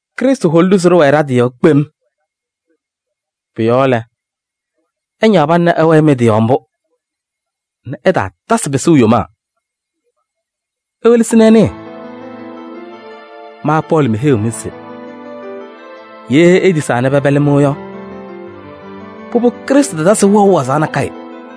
Krɩstʋ holi-ɖʋ se ɖɩwɛɛ ɖa-tɩ yɔɔ kpem. Pʋ-yɔɔ lɛ, ɩñaɣ pana nɛ ɩwɛɛ mɩ-tɩ yɔɔ mbʋ nɛ ɩtaatasɩ pɩsʋʋ yomaa. Iwelesi nɛ ɩnɩɩ, ma Pɔɔlɩ meheyiɣ-mɩ se: ye itisaa nɛ pɛpɛlɩ-mɩ yɔ, pʋbʋ Krɩstʋ tatasɩ-mɩ wɛʋ wazaɣ nakɛyɛ.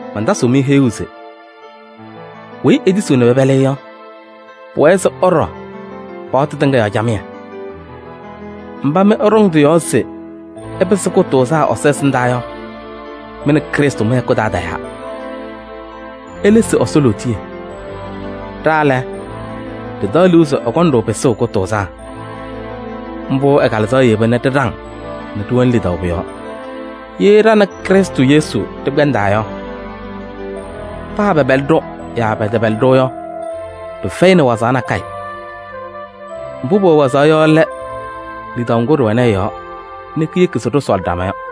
Mantasɩɣ-mɩ heyuu se: weyi etisiɣ nɛ pɛpɛlɩ-ɩ yɔ, pʋwɛɛ se ɛɖɔ paɣtʋ tɩŋa yɔɔ camɩyɛ. Mba mɩ ɩɖɔŋ tɩ-yɔɔ se ɩpɩsɩ kʋtʋʋzaa Ɛsɔ ɛsɩndaa yɔ, mɩ nɛ Krɩstʋ mɩ-hɛkʋ taa tayaa, ilesi Ɛsɔ lootiye. Ɖa lɛ, ɖɩtaɣ liu se ɛkɔŋ-ɖʋ pɩsʋʋ kʋtʋʋzaa. Mbʋ ɛ-Kalɩzaɣ yeba nɛ ɖɩɖaŋ nɛ ɖɩwɛnɩ lidaʋ pʋ-yɔɔ. Ye ɖa nɛ Krɩstʋ Yesu ɖɩkpɛndaa yɔ, paa pɛpɛlɩ-ɖʋ yaa pɛtɛpɛlɩ-ɖʋ yɔ, pɩfɛyɩnɩ wazaɣ nakɛyɛ: mbʋ pʋwɛ wazaɣ yɔ lɛ lidaʋ ŋgʋ ɖɩwɛnɩ ɛ-yɔɔ nɛ kiyeki se ɖɩsɔɔlɩ ɖama yɔ.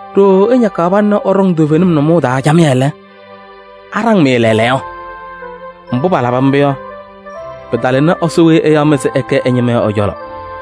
Ɖooo ɩñakaɣ pana nɛ ɩɖɔŋ toovenim nʋmɔʋ taa camɩyɛ lɛ, aɖaŋ-mɩ lɛɛlɛɛyɔ? Mbʋ palaba mbʋ yɔ, pɩtalɩnɩ Ɛsɔ weyi ɛyaɣ-mɩ se ɩkɛ ɛ-ñɩma yɔ ɛ-cɔlɔ.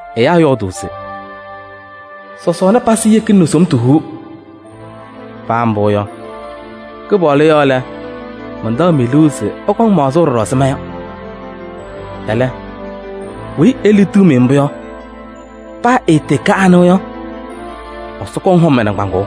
Ɛyaa yɔɔdʋʋ se: “Sɔsɔɔna pazɩ yekina nɛ somtu huu.” Paa mbʋ yɔ, Kɩpaɣlʋ yɔɔ lɛ, mantaɣ-mɩ liu se ɩkɔŋ maɣzʋʋ ɖɔɖɔ ɛzɩ ma yɔ. Ɛlɛ, weyi eliɣtiɣ-mɩ mbʋ yɔ, paa ɛtɩɩkɛ anɩ yɔ, Ɛsɔ kɔŋ hɔm ɛ-nɩŋgbaaŋ.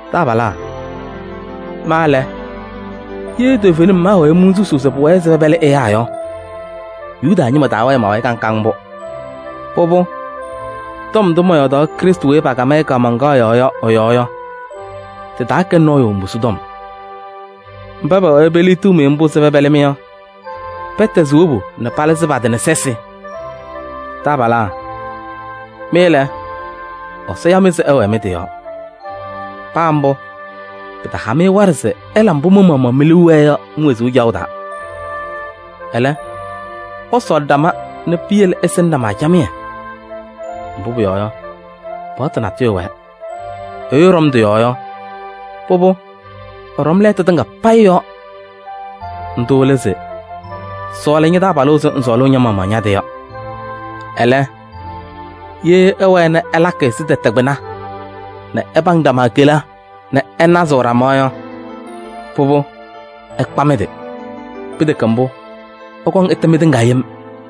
Taabalaa! Ma lɛ, ye toovenim maawɛɛ monsusuu se pʋwɛɛ se pɛpɛlɩ ɛyaa yɔ, Yuda ñɩma taawɛɛ ma-wayɩ kaŋ kaŋ mbʋ. Pʋbʋ, tɔm ndʋ mɔyɔɔdaɣ Krɩstʋ weyi pakam-ɩ kaamaŋkaɣ yɔɔ yɔ ɛ-yɔɔ yɔ, tɩtaakɛnɩ nɔɔyʋ mbusu tɔm. Mba pɛwɛɛ peliɣtiɣ-mɩ mbʋ se pɛpɛlɩ-mɩ yɔ, pɛtɛzɩ wobu nɛ palɩzɩ pa-tɩ nɛ sɛsɩ! Taabalaa! Mɩ lɛ, Ɛsɔ ya-mɩ se ɩwɛɛ mɩ-tɩ yɔɔ. Paa mbʋ, pɩtaha-mɩ waɖɛ se ɩla mbʋ mɩ-maɣmaɣ mi-liu wɛɛ yɔ mi-wezuu caɣʋ taa. Ɛlɛ, ɩsɔɔlɩ ɖama nɛ piyele ɩsɩnɩ ɖama camɩyɛ. Mbʋ pʋyɔɔ yɔ, paɣtʋ natʋyʋ wɛɛ, ɛyʋ ɛɖɔm tɩ-yɔɔ yɔ, pʋbʋ, ɛɖɔm lɛɛtʋ tɩŋa payɩ yɔɔ. Ndʋ lɛ se: “Sɔɔlɩ ña-taabalʋ ɛzɩ ŋsɔɔlʋʋ ña-maɣmaɣ ña-tɩ yɔ.” Ɛlɛ, ye ɩwɛɛ nɛ ɩlakɩ ɛzɩ tɛtɛ kpɩna nɛ ɩpaŋ ɖama kela nɛ ɩnazɩɣ ɖama yɔ, pʋbʋ, ɩkpa mɩ-tɩ. Pɩtɛkɛ mbʋ, ɩkɔŋ ɩtɛ mɩtɩŋa yem.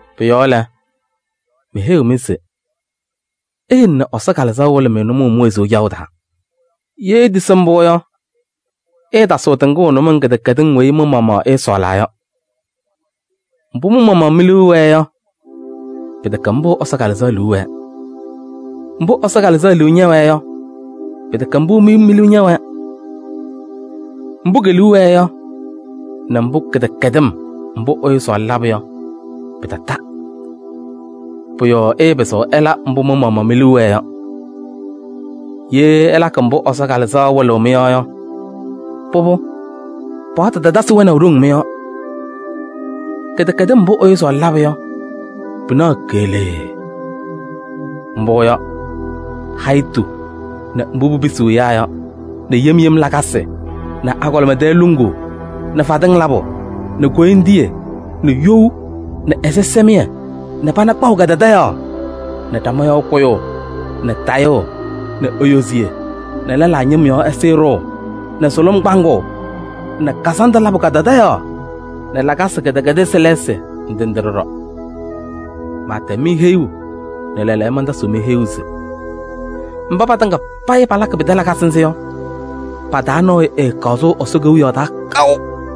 Pʋ-yɔɔ lɛ, meheyiɣ-mɩ se: iyele nɛ Ɛsɔ Kalɩzaɣ wɩlɩ-mɩ nʋmɔʋ mi-wezuu caɣʋ taa. Ye itisi mbʋ yɔ, ɩɩtasɩɣ tɩŋʋʋ nʋmɔŋ kɩdɛkɛdɩŋ weyi mɩ-maɣmaɣ ɩsɔɔlaa yɔ. Mbʋ mɩ-maɣmaɣ mi-liu wɛɛ yɔ, pɩtɛkɛ mbʋ Ɛsɔ Kalɩzaɣ liu wɛɛ. Mbʋ Ɛsɔ Kalɩzaɣ liu ñɛwɛɛ yɔ, pɩtɛkɛ mbʋ mi-liu ñɛwɛɛ. Mbʋ ke-liu wɛɛ yɔ nɛ kɩdɛkɛdɩm mbʋ ɛyʋ sɔɔlɩ labʋ yɔ, pɩtata. Pʋ-yɔɔ ɩɩpɩzɩɣ ɩla mbʋ mɩ-maɣmaɣ mi-liu wɛɛ yɔ. Ye ɩlakɩ mbʋ Ɛsɔ Kalɩzaɣ wɩlɩɣ-mɩ yɔ yɔ, pʋbʋ, paɣtʋ tatasɩ wɛnaʋ ɖoŋ mɩ-yɔɔ. Kɩdɛkɛdɩm mbʋ ɛyʋ sɔɔlɩ labʋ yɔ, pɩnaɣ keɣlee. Mbʋ yɔ: hayitu nɛ mbʋ pipisiɣ ɛyaa yɔ nɛ yem yem lakasɩ nɛ agɔlɩma tɛɛ luŋuu nɛ fadɩŋ labʋ nɛ koyindiye nɛ you nɛ ɛzɩsɛmɩyɛ nɛ pana kpaʋ kadadaɣyaɣ nɛ ɖama yɔɔ kʋyʋʋ nɛ tayʋʋ nɛ eyoziye nɛ lɛlaa ñɩm yɔɔ ɛzɩyɛ ɖʋʋ nɛ sʋlʋm kpaŋʋʋ nɛ kazandʋ labʋ kadadaɣyaɣ nɛ lakasɩ kɩdɛkɛdɩsɩ lɛɛsɩ ndɩ ndɩ ɖɔɖɔ. Maatɛm-mɩ heyuu nɛ lɛɛlɛɛyɔ mantasɩɣ-mɩ heyuu se: mba patɩŋa payɩ palakɩ pɩtɛ lakasɩ nzɩ yɔ, pa-taa nɔɔyʋ ɛɛkaɣ sʋʋ Ɛsɔ Kewiyaɣ taa kaʋ.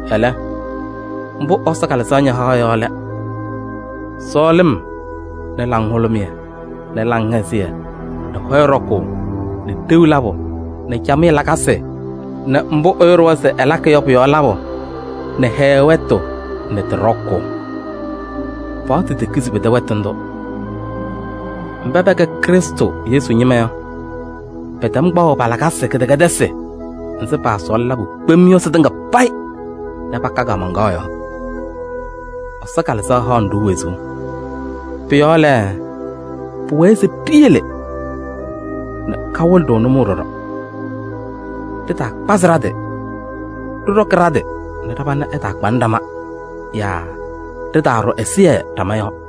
Ɛlɛ, mbʋ Ɛsɔ Kalɩzaɣ ñahaɣ yɔ lɛ: sɔɔlɩm nɛ laŋhʋlʋmɩyɛ nɛ laŋhɛzɩyɛ nɛ hɔyɛ ɖɔkʋʋ nɛ ɖeu labʋ nɛ camɩyɛ lakasɩ nɛ mbʋ ɛyʋ ɖʋwa se ɛlakɩ yɔ pʋ-yɔɔ labʋ nɛ hɛɛɛ wɛtʋ nɛ tɩ ɖɔkʋʋ. Paɣtʋ tekizi pɩtɛ wɛtʋ ndʋ. Mba pɛkɛ Krɩstʋ Yesu ñɩma yɔ, pɛtɛm kpaɣʋ pa-lakasɩ kɩdɛkɛdɩsɩ nzɩ paasɔɔlɩ labʋ kpem yɔ sɩtɩŋa payɩ nɛ paka kaamaŋkaɣ yɔɔ. Ɛsɔ Kalɩzaɣ haɣnɩ-ɖʋ wezuu. Pʋ-yɔɔ lɛ, pʋwɛɛ se ɖiyele nɛ kawɩlɩ-ɖʋ nʋmɔʋ ɖɔɖɔ. Ɖɩtaakpazɩ ɖa-tɩ, ɖɩɖɔkɩ ɖa-tɩ nɛ ɖa-pana ɛtaakpanɩ ɖama yaa ɖɩtaaɖʋ ɛzɩyɛ ɖama yɔɔ.